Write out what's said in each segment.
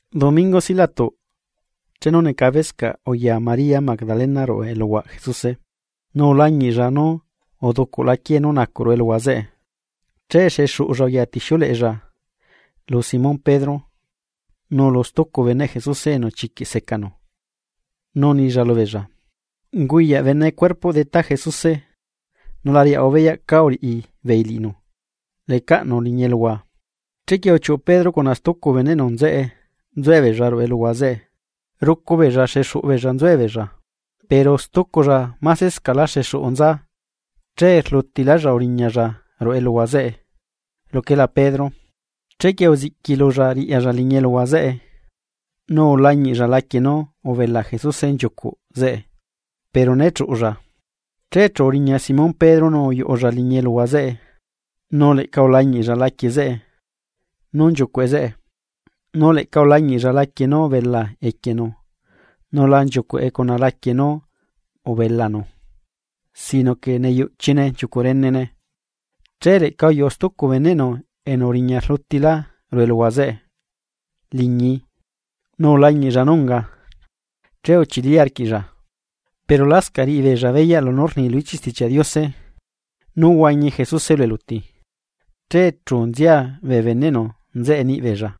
Domingo silaꞌtuꞌ, chenu necabescaꞌ uyaa María Magdalena ruꞌu eluhuaꞌ Jesuse, nu ulañiꞌlla nú uducuꞌla quiee nú nacuꞌ ruꞌu eluhua zeꞌe, che xexuꞌulla uyatixiuleꞌella lu Simón Pedro nu lu stucu beneꞌ Jesuse enu chiquiꞌ secanu, nu unilla lubeella: ―¡Unguyaꞌ bene cuerpoꞌ Detá Jesuse nu la riaꞌahua beyaꞌ cá uriꞌi beei liꞌinu lecaꞌnu liñi eluhua! Chequie uchiuꞌu Pedro cuna stucu beneꞌnu, nzuebeella ruꞌu eluhua zeꞌe. Rucu beella xuxuꞌu beella nzuella pero stuculla másela xexuꞌu nza che rlutilálla uriñalla ruꞌu eluhua zeꞌe luquela Pedro. Chequie uziꞌquilulla riꞌyalla liñi eluhua zeꞌe, nu ulañiꞌlla laquie nú ubela Jesuse nchiucuꞌ zeꞌe pero né chuꞌulla. Che chu uriña Simón Pedro nu uyuꞌulla liñi eluhua zeꞌe nu leꞌca ulañiꞌlla laquie zeꞌe nú nchiucuꞌe zeꞌe, nu leꞌca ulañiꞌlla laquie nú ubela equienu nu la nchiucuꞌe cuna laquie nú ubela cuerpoꞌnu sino que neyuꞌchine nchiucuꞌ renene. Che leꞌca uyuꞌu stucu beneꞌnu enu uriña rlutilá liñi eluhua zeꞌe nu ulañiꞌlla nú unga, che uchili arquiꞌlla. Pero lascaꞌ riꞌibeella beyaꞌ lunú rni lu ichiꞌ Stichiaꞌ Diose nú huañi Jesuse lu eluti. Che chu nzia bee beneꞌnu nzeꞌe niꞌbeella.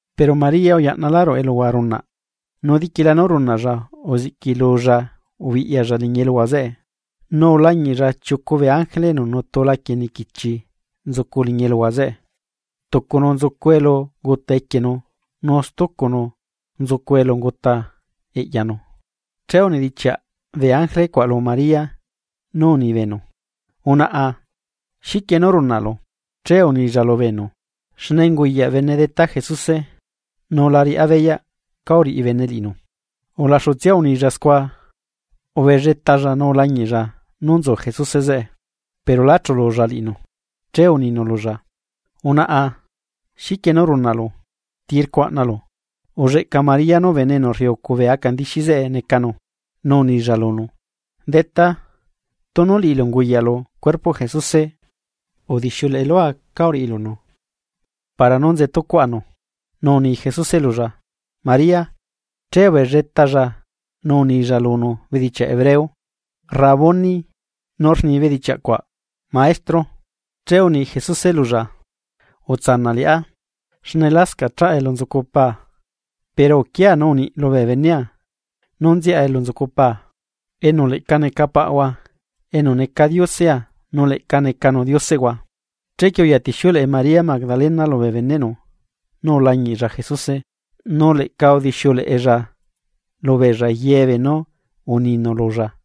Pero María uyaꞌnalá ruꞌu eluhua runaꞌ. Nu diquila nú runaꞌlla uziꞌquilulla ubiꞌyalla liñi eluhua zeꞌe, nu ulañiꞌlla chiucu bee ángele enu nutu laquie niquichi nzucu liñi eluhua zeꞌe. Tucunu nzucu elu unguta equienu nu stucunu nzucu elu unguta eꞌyanu. Che unidichiaꞌ bee ángele cuaꞌ lu María nú uni beenu: ―Unaꞌa, ¿xiquie nú runaꞌlu? Che unilla lubeenu: ―Xne unguyaꞌ bene cuerpoꞌ Detá Jesuse, nu la riꞌá beyaꞌ cá uriꞌi bene liꞌinu. Ulaxutsia unilla scua, ubelletalla nu ulañiꞌlla nú nzu Jesuse zeꞌe, pero lá chululla liꞌinu. Che uninu lulla: ―Unaꞌa, ¿xiquie nú runaꞌlu? ¿Ti rcuaꞌnalu? Ulleꞌca María nú bene enu rriucu bee aca ndixi zeꞌe necanu, nu unilla lunu: ―Detá, tunu liꞌilu unguyaꞌlu cuerpoꞌ Jesuse, udixiuleꞌe lua cá uriꞌilunu para nú nzetucuaꞌanu. Nu uni Jesuse lulla: ―¡María! Che ubelletalla nu unilla lunu bedichiaꞌ hebreo: ―¡Rabuni! ―nu ni bedichiaꞌ cuaꞌ: Maestro. Che uni Jesuse lulla: ―Utsanaꞌ liꞌá, xne lascaꞌ chaꞌa elu nzucu Paa, pero uquia nu uniꞌ lubee benea nú nziaꞌa elu nzucu Paa, enu leꞌca neca Paꞌhua nu neca Diosea, nu leꞌca necanu Dioseꞌhua. Chequie uyatixiuleꞌe María Magdalena lubee beneꞌnu nú ulañiꞌlla Jesuse nu leꞌca udixiuleꞌella lubeella yebeenú uninu lulla.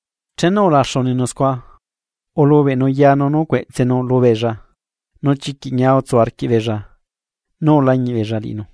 Chenu ulaxu uninu scua, ulubeꞌnu yanu nu cueꞌtsenu lubeella. Nu chiquiꞌ ñia utsu arquiꞌbeella nú ulañiꞌ beella liꞌinu.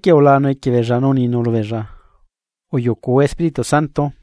Chequie ulaanu equie beella nu uninu lubeella: ―Uyucuhua Espíritu Santo.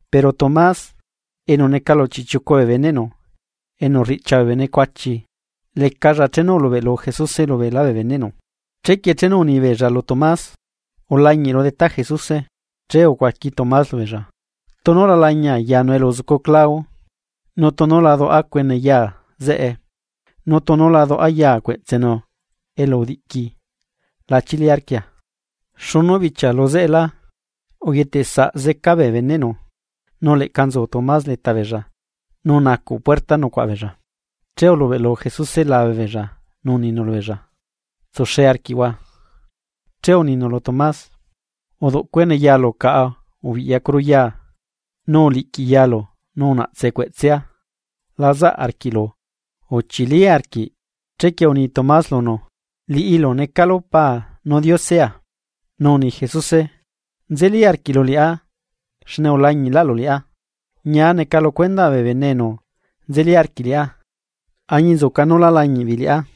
Pero Tomás, enu neca lu chiꞌchiucu bee beneꞌnu, enu rriꞌchia bee bene cuachi lecalla chenu ulubeꞌlu Jesuse lubeelá bee beneꞌnu. Chequie chenu uni beella lu Tomás: ―Ulañiꞌru Detá Jesuse. Che ucuaqui Tomás lubeella: ―Tunu la lañia yanu elu uzucu clau, nu tunu la duaꞌa cuene yaa zeꞌe nu tunu la duꞌa yaa cueꞌtsenu elu udiꞌqui, la chili arquia. Xunu bichia luzeꞌelá, uyetesaꞌ zeca bee beneꞌnu nu leꞌca nzu Tomás leta beella nu nacuꞌ puerta nucuaꞌa beella, che ulubeꞌlu Jesuse lubeella nu uninu lubeella: ―¡Tsuxe arquiꞌhua! Che uninu lu Tomás: ―Uduꞌ cuene yaalu caꞌa nu ubiꞌyacuru yaa, nu uliꞌqui yalu nu unaꞌtse cueꞌtsea la zaꞌ arquiꞌlu. ¡Uchili arquiꞌ liꞌá! Chequie uni Tomás lunu: ―¡Liꞌilu necalu Paa nu Diosea! Nu uni Jesuse: ―¿Nzelí arquiꞌlu liꞌá xne ulañiꞌlaꞌlu liꞌá? ¡Ñia neca lu cuendaꞌ bee bene enu nzeli arquiꞌ liꞌá añinzuca nú lá lañiꞌ beei liꞌá!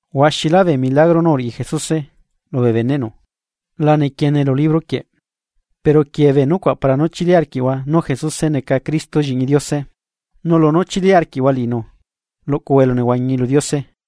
Huaxilá bee milagro nú uriꞌi Jesuse lubee beneꞌnu nu lá quiee lu libro quieꞌ. Pero uquiee bee nucuaꞌ para nú chili arquiꞌhua nú Jesuse neca Cristo lliꞌñi Diose, nu lunú chili arquiꞌhua liꞌinu luꞌcuhua elunehuañi lu Diose liñibe.